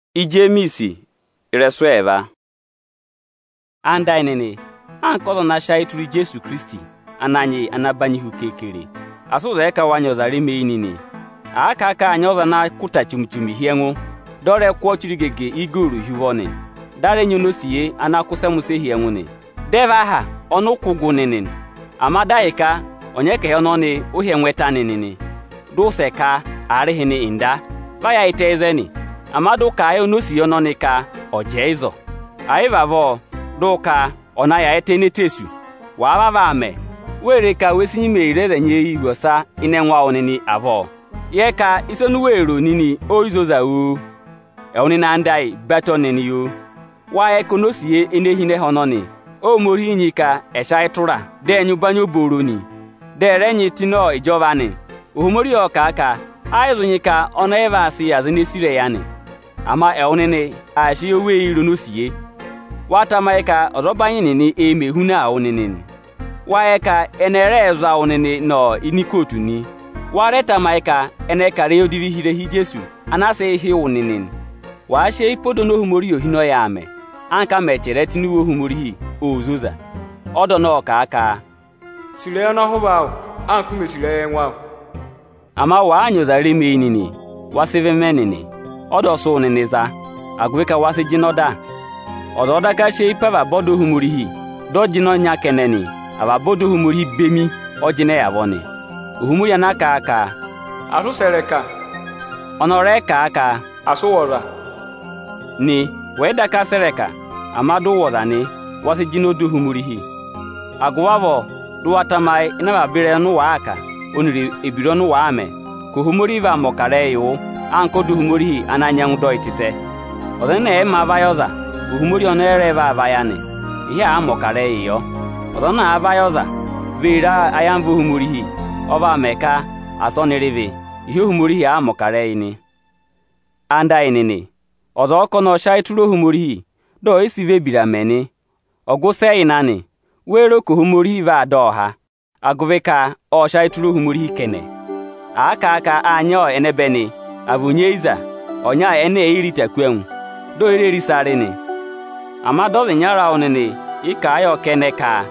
Ẹwụ nịnị ẹyịnyara amị, anka ọza ana sị ayị tụra Ijeesu Ikirisiti Ananyị yị ana nyị ụbanyị hu keekere, asị ụ zẹẹ ka wa nyị ọza remeyi nịnị o! Àa kà a ka àa nyị ọza ana kụ́ ịta chomi-chomi hi ẹngụ, dị ọ rẹ sị ochirigege igooru tụ ụvọ nị. Dị a rẹ nyị onosiye ana kụ́ ụsẹmụsẹ hi ẹngụ nị. Dị ẹ vẹ aha ọnị ụ kụ́ gụ nịnị nị. Ama dị ahịka ọnyẹkẹhị ọnọnị ụ hị́ ẹngụ ẹtẹ anị nị, dị ụ wụsẹ ka: Aarịhịnị Nda, va yaayịtẹ ịzẹnị, ama dị ụ kà a yị onosiye ọnọnị ka ọ̀ jẹẹ ịzọọ, ẹ̀ yị vị avọọ, dị ụ ka ọ̀ na yaayịtẹ ini eteesu. Wàa vavọọ aa mẹ, wee re ka we si nyima ee re aza ẹnyị eyii hu ọsa ịnị ẹngụ awụ nịnị avọọ? Yẹ ka ịsa oni u wee ro nịnị o yi zoza oo! Ẹwụ nịnị ẹyịnyara amị oni mi sì, batọ nịnị oo! Wáá yẹ ka onosiye ene hi ịnị ẹhẹ ọnọnị Óhomorihi nyị ka ẹ̀ sị ayị tụraa, dị ẹ̀ nyị ụbanyị obooro nị, dị ẹ̀ rẹ nyị tụ́ ịnị ịjọva anị? Ohomorihi ộ kà a ka ẹ́ yị zụ nyị ka ọnị ọ yị vaa sịị yị aza ene sì ịrẹyị anị. Ama ẹwụ nịnị aa sị oweyii re onosiye. Wáá tamayị ka ọzọbanyị nịnị ẹẹ̄ mẹ ehunaa wụ nịnị nị? Wáá yẹ ka ẹnị ẹ rẹẹ za wụ nịnịị nọ ikootu nị? Wáá rẹ tamayị ka ẹnị ẹẹ̄ kà ịrẹyị odivii hi ịrẹha Ijeesu ana aa sịị hị́ wụ nịnị nị? Wàa sị eyi pe ọda oni Ohomorihi ohinọyị ayị mẹ, anka a mẹ̀ chẹrẹ ẹ tụ́ ini iwe Ohomorihi óo zoza. Ọda ọnọọ ộ kà a ka: Sì ịrẹyị ọnọhụva awụ anka u mè sì ịrẹyị ẹngụ awụ. Ama wàaa nyị ọzaa remeyi nịnị, wa sị ịvị mẹ nịnị; ọda ọ sị wụ nịnị za, agụvị ka wa sị jịnẹ ọda nịnị. Ọza ọ̀ọ daka sị eyi pe avaba ọda Ohomorihi, dị ọ jịnẹ ọnya kẹnẹ nị, avaba ọda Ohomorihi bemi ọ jịnẹ avọọ nị. Ohomorihi ana kà a ka: Asị ụ sẹ̀ ịrẹka, ọnị ọ rẹ kà a ka: Asị ụ wụ̀ ọza nị. Wẹ̀ yị daka sẹ̀ ịrẹka, ama dị ụ wụ̀ ọza nị, wa raà jịnẹ ọda Ohomorihi. Agụvị avọọ dị ụ wa tamayị ịnị avaba ịrẹyị ọnị ụ waa kà, ọnịrị ebira ọnị ụ waa mẹ, ka Ohomorihi vaa mẹ̀ ọkarẹyị yị wụ anka ọda Ohomorihi ana nyẹngụ dọ yị tịtẹ. Ọza ẹnẹ ẹ̀ yị mā vayị ọza, Ohomorihi ọnị ọ yị rẹ vaa vayị anị, ịhị àaa mẹ̀ ọkarẹyị yọ. Ọza anaā vayị ọza, vee re ka ayamva Ohomorihi ọ vaa mẹ ka asị ọnị rị ịvị, ịhị Ohomorihi àaa mẹ̀ ọkarẹyị nị. Ẹwụ nịnị ẹyịnyara amị, ọza ọ̀ọ ka ọnị ọ́ọ sị ayị tụra Ohomorihi, dị ọ̀ yị sị vị ebira mẹ nị, ọgụ ịsị ẹ yà ịnị anị? Wéé ro ka Ohomorihi vaa dọ ọ há agụvị ka ộ sị ayị tụra Ohomorihi kẹnẹ? À kà a ka áa nyị ẹnẹbẹnị, àa vị onyeyiza ọnya ene è yi re ịta kú ẹngụ, dị è yi re re ịsa rị nị, ama dị ọza ịnyara awụ nịnị yị kà a yọ kẹnẹ ka: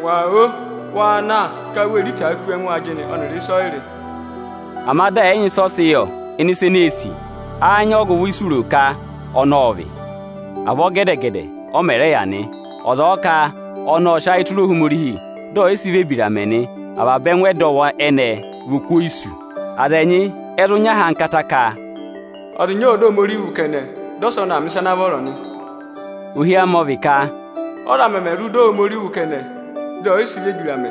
Ngwa o! Wa na ka u vee re itaa kú ẹngụ ajịnị ọnịrị ịsọyịrị, ama di ẹ̀ yị nyị ịsị ọ sị yọ ịnị ịsa ene ee sì nị, áá nyị ọgụvọ ịsị u ro ka ọ́ọ vị? Avọọ gẹdẹ-gẹdẹ ọ mẹ̀ rẹ yà nị; ọza ọ̀ọ ka ọnị ọ́ọ sị ayị tụra Ohomorihi, dị ẹ̀ yị sị vị ebira mẹ nị, ẹngụ ẹdọwụ ẹnẹẹ vị oku oyisu. Aza ẹnyị ẹ zụ nyị ahankata ka: Ọza ịnya ộ dọ Ohomorihi wụ́ kẹnẹ, dị ọsa ọnị aa mẹ̀ ịsa ana vọrọ nị. Ohi amị ọ vị ka: Ọ́za mẹmẹ nyẹngụ dọ Ohomorihi wụ́ kẹnẹ dị ẹ yị sị vị ebira mẹ?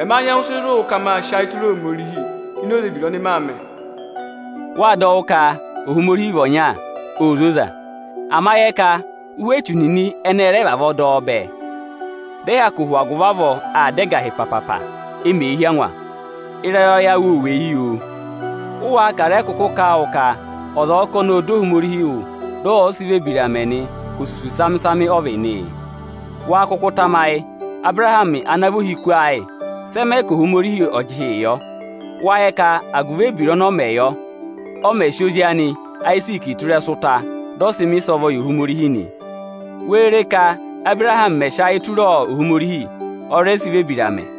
Ẹma nyẹngụ sị zụ wụ ka maa sị ayị tụra Ohomorihi ini oze ebira ọnị maa mẹ̀. Wâ dọ wụ́ ka Ohomorihi vị ọnya, óo zoza. Ama ụhwẹ echu nịnị ẹnị ẹ rẹ vavọọ dọ bẹẹ, dị ẹ hyakụ hụ agụvị avọọ aa da ẹgahị papapa, e mee hí angwa. Ịrẹyọyẹ awụ óo weyi oo! Ụ́ wáá ka à rẹ kụkụ kà a wụ ka ọza ọ̀ọ ka ọnị ọ́ọ dọ Ohomorihi wụ́, dị ọ̀ yị sị vị ebira mẹ nị, ka osusu samị-samị ọ vị nị? Wáá kụkụ tamayị Abụrahamị ana vị ohiku ayị? Sị ẹ mẹ ka Ohomorihi ọ̀ jị ịhị yọ? Wáá yẹ ka agụvị ebira ọnị ọ mẹ yọ, ọ̀ mẹ̀ sị ozi anị Ayiziiki tụ́ ịrẹsụ ụta, dị ọ sị mẹ̀ ịsọvọ yị Ohomorihi nị. Wee re ka Ábụrahamị mẹ̀ sị ayị tụra Ohomorihi, ọ rẹ sị vị ebira mẹ?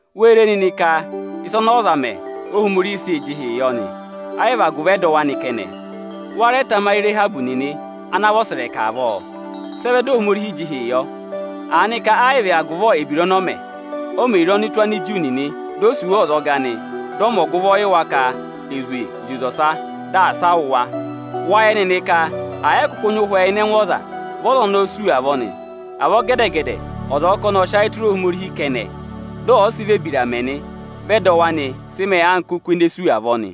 Wée re nịnị ka ịsa ọnị ọza mẹ, Óhomorihi sịị̄ jị ịhị yọ nị, ẹ́ yị vị agụvị ẹdọwụ anị kẹnẹ. Wáá rẹ tamayị Ịrahabị nịnị ana vị ọsẹrẹka avọọ? Sị ẹ vẹ dị Ohomorihi jị ịhị yọ? Aanịka ẹ yị vị agụvị ebira ọnị ọ mẹ? O mè re ọnụtụ Aniju nịnị, di o sì wa ọzọga nị; dị ọ mẹ ọgụvọ yị wa ka è zwe zị oze ọsa, dị asị a wụ̀ wa nị. Wâ yẹ nịnị ka, ẹ̀ yị kụkụ nyị ụhwẹ ịnị ẹngụ ọza, vị ọza ọnọọ sú avọọ nị. Avọọ gẹdẹ-gẹdẹ ọza ọ̀ọ ka ọnị ọ́ọ sị ayị tụra Ohomorihi kẹnẹ, dị ọ̀ yị sị vị ebira mẹ nị, vị ẹdọwụ anị sị mẹẹ anka oku ene sú avọọ nị.